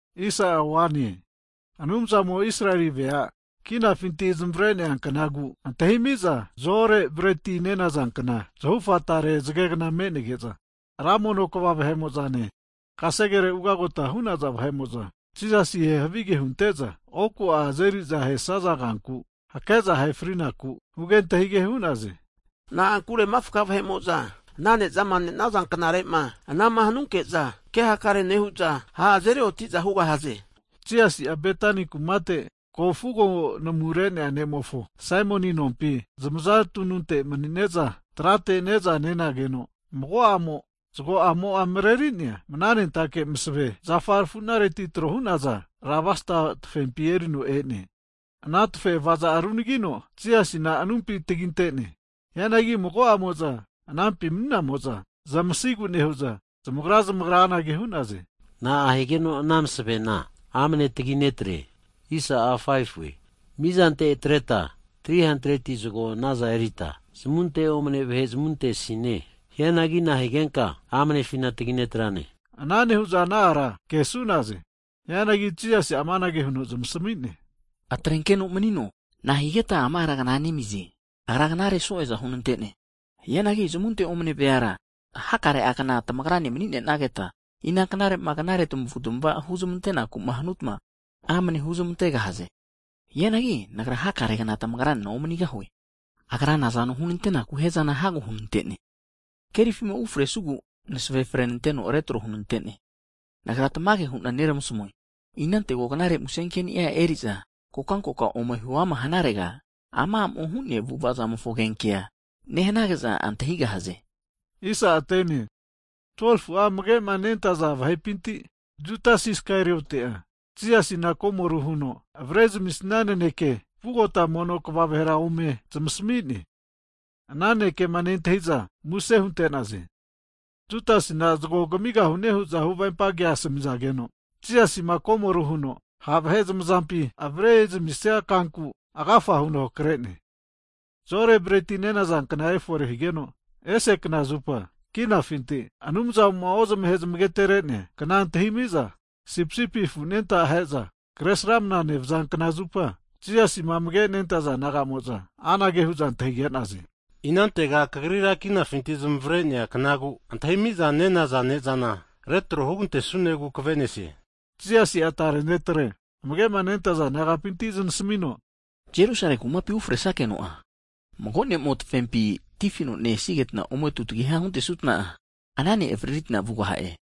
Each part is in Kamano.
Hagi Anumzamo'ma Israeli veama kinafinti zamare'nea kanagu antahimi'za zo'ore breti nenaza kna zahufa tare zagegna me'nege'za, ra mono kva vahe'mo'zane, kasegere ugagota hu'naza vahe'mo'zane, Jisasima havige hunte'za oku azerizama ahesaza kanku hake'za ahe fri'naku huge antahige hu'naze. Na'ankure mafka vahe'mo'za ana ne'zama (pasova) nenaza knare'ma ana'ma hanunke'za, ke hakare nehu'za ha' azeri oti'za hugahaze. Hagi Jisasi'a Betani kumate ko'ma fugo namumare'nea ne'mofo Saimoni nompi, zamaza tununte manine'za trateti ne'za nenageno, mago a'mo'a zago'amo'a mareri'nea, mananentake masave zafa rafunareti tro hu'naza, alabasta tafempi erino e'ne. Ana tafe avaza'a runagino Jisasina anumpi taginte'ne. Hianagi mago'amo'za anampi mani'namo'za zamasigu nehu'za, zamagra zamagra anage hu'naze, Na'a higeno ana masavena amne tagi netre? Mizante atreta 300'a silva zago nazana erita zamunte omane vahe zamuntesine. Hianagi nahigenka amnefina tagi netrane? Anage nehu'za ana ara kesu'naze. Hianagi Jisasi'a amanage huno zamasmi'ne, Atrenkeno manino, nahigeta ama ara knanemize? Agra knare so'eza hunenante. Hianagi zamunte omane veara hakare kna tamagrane mani'nenageta, ina knare'ma, knare tamavu tamavama huzmantenaku'ma hanutma, amne huzamantegahaze. Hianagi Nagra hakare kna tamagranena omanigahue. Agra nazano hunantenaku hiazana hago hunante. Kerifima ufresugu masave frenanteno retro hunante. Nagra tamage hu'na neramasamue, inantego knare musenkeni'a, eri'za kokankoka ome huama hanarega, ama a'mo hu'nea avu'avamofo agenkea, nehanage'za antahigahaze. Hagi 12fu'a amage'ma nentaza disaipol nagapinti, Judas Iskarioti'a Jisasina komoru huno avrezamisia naneke vugota mono kva vahera ome zamasami'ne. Ana nanekema nentahiza muse hunte'naze. Judasina zago kamigahune hu'za huvempa kea asamizageno, Jisasima komoru huno ha' vahe zamazampi avare'zamisia, kanku agafa huno hakre'ne. Hagi (Zo'ore breti nenaza kna efore higeno) ese knazupa kinafinti Anumzamo'ma ozmahe zamagatere'nea kna antahimiza sipisipi afu anenta aheza Kresramana nevaza knazupa, Jisasima amage nentaza disaipol naga'mo'za anage hu'za antahige'naze, Inantega Kagrira kinafinti zmavre'nea knagu antahimi'za nenaza (Pasova) ne'zana retro hugantesunegu kave'nesie? Hazageno Jisasi'a tare disaipol ne'tre amage'ma nentaza nagapinti zanasmino, Jerusalemi kumapi ufresakeno'a, mago ne'mo'a tima afi kavofi tifino ne-enketa ome tutagiha huntesuta, ana ne' avaririta vugaha'e.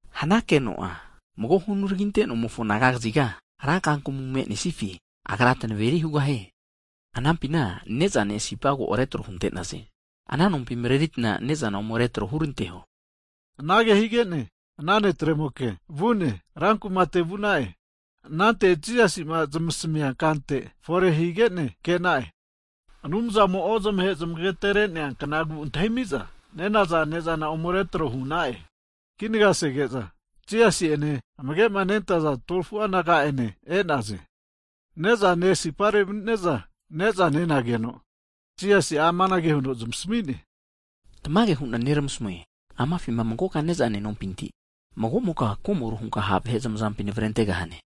Hanankeno'a mago hunaraginte nomofo anaga kaziga, ra kakamu me'nesifi agra tanaveri hugahie. Anampina ne'zane sipa ko retro hunte'naze. Ana nompi mareritna ne'zana ome retro huranteho. Anage hige'ne ana netre mokea rankumate vu'na'e. Anante Jisasi'ma zanasami'nea kante fore higene ke'na'e. Anumzamo'ma ozmahe zamagatere'nea knagu antahimiza nenaza ne'zana ome retro hu'na'e. Kinaga sege'za, Jisasi ene amagema nentaza 12fu'a disaipol naga'ane e'naze. Ne'zane sipare mani'neza ne'za nenageno, Jisasi'a amanage huno zamasmi'ne, Tamage hu'na neramasamue, amafima magoka nezama nenompinti, mago'moka komoru hunka ha' vahe zamazampi navrentegahane.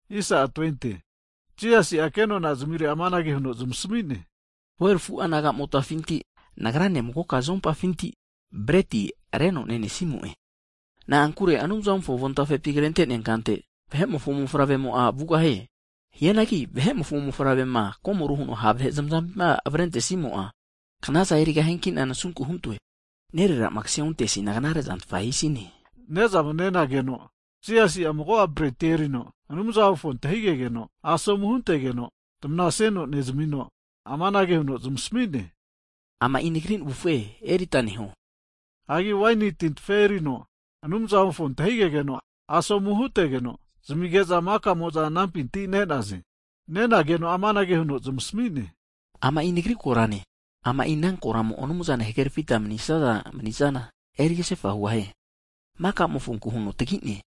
Hazageno Jisasi'a kenona zamirera amanage huno zamasami'ne, 12fu'a nagamotafinti, Nagrane magoka zoumpafinti breti areno nenesnimo'e. Na'ankure Anumzamofo avontafepi krente'nea kante, Vahe'mofo Mofavremo'a vugahie. Hianagi Vahe'mofo mofavrema komoru huno ha' vahe zamazampima avrente'simo'a, knaza erigahiankina nasunku huntoe. Nererama kase onteasina knare'zantfa hisine! Hagi ne'zana nenageno, Jisasi'a mago breti erino Anumzamofo antahigegeno asomu hutegeno, tamanasino nezmino amanage huno zamasmi'ne, Ama'i Nagri navufe, erita neho. Hagi waini tintafe erino Anumzamofo nunamu huno antahigegeno asomu huntegeno, zamige'za maka'mo'za anampinti ne'naze. Nenageno amanage huno zamasmi'ne, Ama'i Nagri korane, ama ana koramo Anumzane huhagerafita manisaza manizana eri kasefa hugahie. Maka'mofonku huno tagine.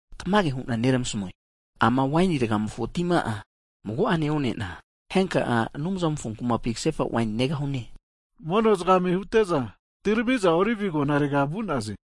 Tamage hu'na neramasmue, Waini ragamofo tima'a mago'ene one'na henka'a Anumzamofo kumapi kasefa waini negahue. Mono zagame hute'za, atirami'za Olive Agonarega vu'naze.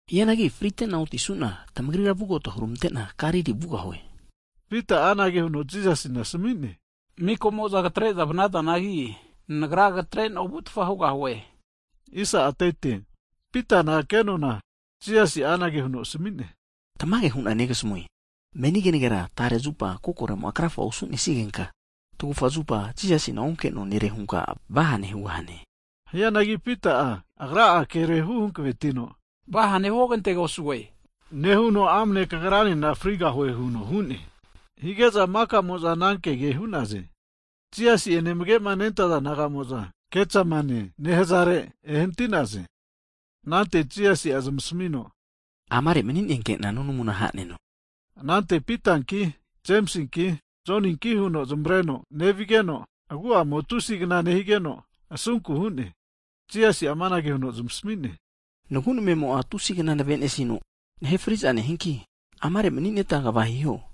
Hianagi fritena otisuna, tamagrira vugota huramante'na Galili vugahue. Higeno Pita'a anage huno Jisasina asami'ne, mika'mo'za katre'za vanazanagi, nagra katrena ovutfa hugahue. Higeno Pitana kenona Jisasi'a amanage huno asami'ne, Tamage hu'na negasamue, meni kenagera tare zupa kokoremo'a krafa osu'nesigenka, tagufa zupa Jisasina onke'noa nere hunka vahane hugahane. Hianagi Pita'a agra'a kere hu hankavetino, vahane huogantegosue nehuno, amne kagranena friga hanigena frigahue huno hu'ne. Hige'za mika'mo'za ana kege'za hu'naze. Hagi Jisasi'ene amage nentaza disaipol naga'mo'za Getsamenie nehazare ehanati'naze. Anante Jisasi'a zmasamino, Amare mani'nenkena nunamuna haneno. Anante Pitanki, Jemisinki, Joninki huno zmareno nevigeno, agu'amo'a tusi'gna nehigeno, asunku hu'ne. Jisasi'a amanage huno zamasmi'ne, Nagu' namemo'a tusi kna navenesino nahe friza nehianki, amare mani'neta kva hiho.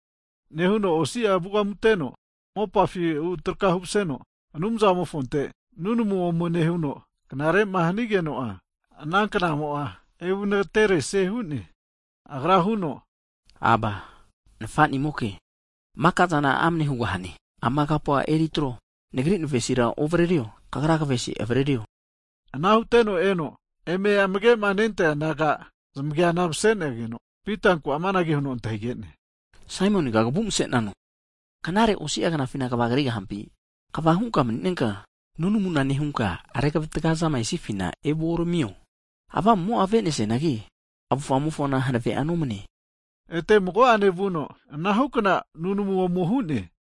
Nehuno osi'a vugamuteno mopafi vutrakahu maseno, Anumzamofonte nunamu ome nehuno, knare'ma hanigeno'a, ana knamo'a evu nagateresie hu'ne. Agra huno, Aba, Nafanimoke! Maka'zana amane hugahane, ama kapua eri atro. Hianagi Nagri navesira ovarario, Kagra kavesi avaririo. Ana huteno eno eme amagema nentaza disaipol nagama zamageana masenageno, Pitanku amanage huno antahige'ne, Saimoniga kavu mase'nano? Knare osi'agnafina kva krigahampi? Kvahuta mani'neta, nunamuna nehuta revatgazama esifina evuoramiho. Tamagu'amofona avenesianagi, tamavufamofona hanave'a nomane. Ete mago'ane vuno, anahu kna nunamu ome hu'ne.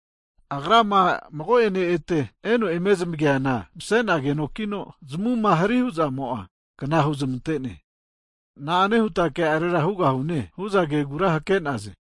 Agrama mago'ene ete eno eme zmageana, mase'nagenokino zamuma hari huzamo'a kna huzmante'ne. Na'ane huta ke'arera hugahune hu'za kegura hake'naze.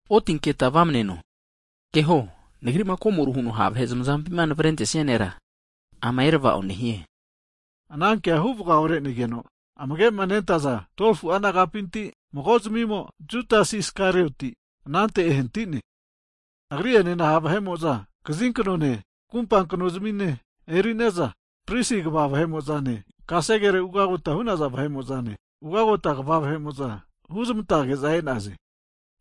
Otinketa tagra vamaneno! Keho Nagri'ma komoru huno ha' vahe zamazampima navrentesia nera, ama erava'o nehie. Hagi anankea huvaga ore'negeno, amage'ma nentaza 12fu'a disaipol nagapinti mago'zmimo, Judas Iskarioti anante ehanatine. Agri'enena sondia vahe'mo'za kaziknontamine, kumpa knozmine eri'neza, pristi kva vahe'mo'zane, kasegere ugagota hu'naza vahe'mo'zane, ugota kva vahe'mo'za huzmantage'za e'naze. Hagi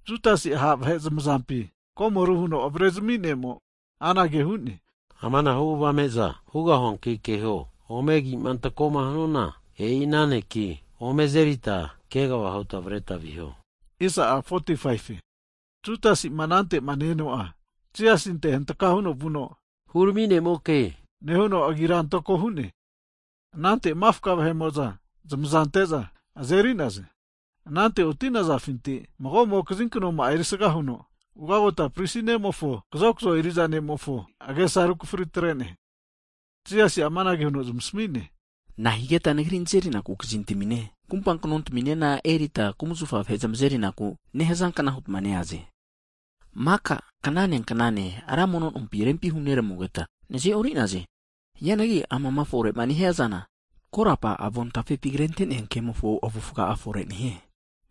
Judasi'a ha' vahe zamazampi komoru huno avrezmi ne'mo'a anage huno zamasami'ne, Amanahu avame'za hugahuanki keho, ome agi'ma antakoma hanuana, e'i ana neki ome azerita kegava huta avreta viho. Hagi Judasi'ma anantema ne-eno'a, Jisasinte hantka huno vuno, Rempi Hurami Nemoke, nehuno agira antako hu'ne. Anante mafka vahe'mo'za zamaza ante'za, azeri'naze. Hianagi oti'nazafinti mago'mo kazinknoma'a erisaga huno, ugagota pristi ne'mofo kazokzo eriza ne'mofo agesa rukfri atre'ne. Jisasi'a amanage huno zamasami'ne, Nahigeta Nagri nazeriku bainati kazintamine kumpa knontaminena eneritma kumzafa vahe zamazeri ku nehazankna hutma neaze? Maka knane knane, ra mono nompi tamagrane maninena rempi huneramugeta, naze'ori'naze. Hianagi amama fore'ma nehizana, korapa avontafepi kre'nea kemofo avufga'a fore nehie.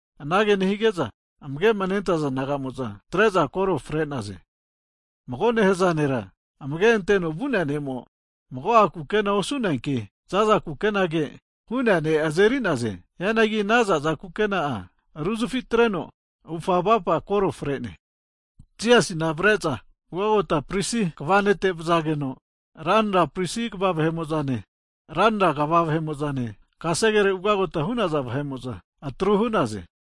Anage nehige'za amage'ma nentaza naga'mo'za, atre'za koro fre'naze. Mago nehaza nera amage anteno vu'nea ne'mo'a, mago'a kukena osu'neanki za'za kukenage'za hu'nea ne' azeri'naze. Hianagi ana za'za kukena'a ruzafi atreno, avufa avapa koro fre'ne. Hagi anante Jisasina avare'za ugagota pristi kva nete vazageno, ranra pristi kva vahe'mo'zane ranra kva vahe'mo'zane, kasegere ugota hu'naza vahe'mo'za atru hu'naze.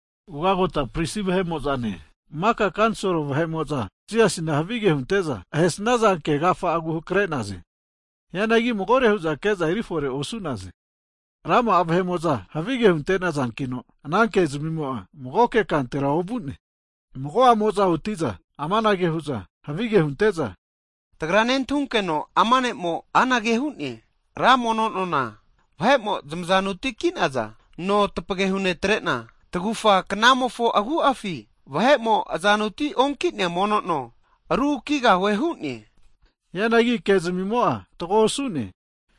Ugagota pristi vahe'mo'zane, maka kanisolo vahe'mo'za Jisasina havige hunte'za ahesnaza ke agafa'agu hakre'naze. Hianagi magore hu'za ke'za eri fore osu'naze. Rama'a vahe'mo'za havige hunte'nazankino, ana kezmimo'a magoke kantera ovu'ne. Mago'amo'za oti'za amanage hu'za havige hunte'za, Tagra nentahunkeno ama ne'mo'a anage hu'ne, Ra mono nona vahe'mo'za zamazanuti ki'naza nona tapage hunetrena, tagufa knamofo agu'afi vahe'mo azanuti onki'nea mono no ru kigahue hu'ne. Hianagi kezamimo'a fatgo osu'ne.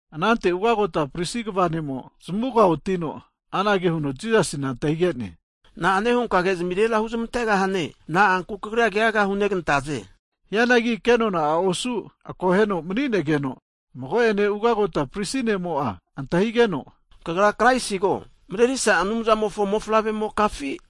Anante ugagota pristi kva ne'mo zamuga otino, anage huno Jisasina antahige'ne, na'ane hunka kezimirera huzmante'gahane? Na'anku Kagrira keaga hunegantaze? Hianagi ke nona'a osu akoheno mani'negeno, mago'ene ugota pristi ne'mo'a antahigeno, Kagra Kraisigo, Mrerisa Anumzamofo mofavremokafi?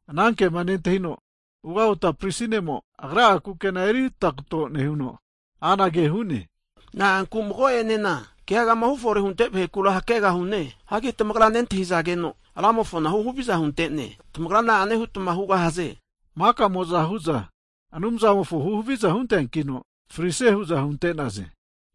Anankema nentahino, ugota pristi ne'mo agra'a kukena eri tagato nehuno anage hu'ne. Na'anku mago'enena keagama hufore hunte vahekura hakegahune. Hagi tamagra nentahizageno Ramofona huhaviza hunte'ne! Tamagra na'ane hutma hugahaze? Makamo'za huza Anumzamofo huhaviza hunteankino frisie hu'za hunte'naze.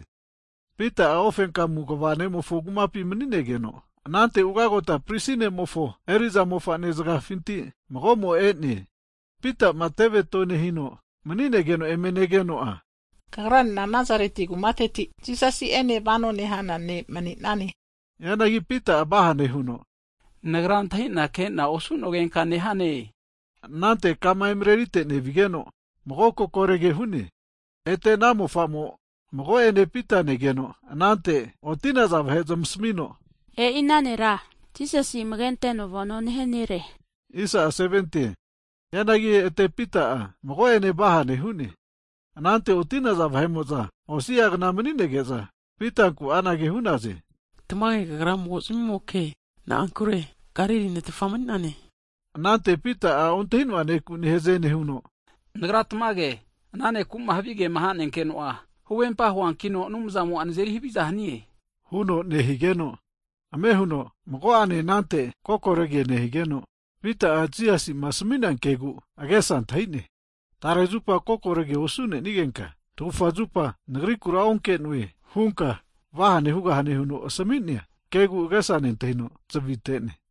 Hagi Pita'a ufenkamuteno kva nemofo kumapi mani'negeno, anante ugagota pristi nemofo eri'za mofane zagafinti mago'mo e'no, Pita'ma teve tonehino mani'negeno eme negeno, kagranena Nazareti kumateti' Jisasi'ene vanoma nehana ne' mani'nane hu'ne. Hianagi Pita'a vahane huno, nagra antahina kena osu'nogenka nehane! Anante kama emrerite nevigeno mago kokorege hu'ne. Ete ana mofa'mo mago'ene Pita negeno anante oti'naza vahe zmasmino, e'i nera Jisasi amage anteno vano nehia nere huno hu'ne! Hianagi ete Pita'a, mago'ene vahane hu'ne. Anante oti'naza vahe'mo'za, osiagna manige'za Pitankura anage hu'za, tamage kagra mago zmimoke. Na'ankure Galili ne' tfa mani'nane. Anante Pita'a Ontahinoa neku nehaze nehuno, nagra tamage ana nekuma havigema hanenkeno'a, huvempa huankino Anumzamo nazeri haviza hanie huno, nehigeno, ame huno mago'ane anante kokorege nehigeno, Pita'a, Jisasi'ma asmi'nea kegu agesa antahi'ne. Tare zupa kokorege osunenigenka, tagufa zupa Nagrikura onkenoe hunka vahane hugahanema huno asami'nea kegu agesa nentahino zavite'ne.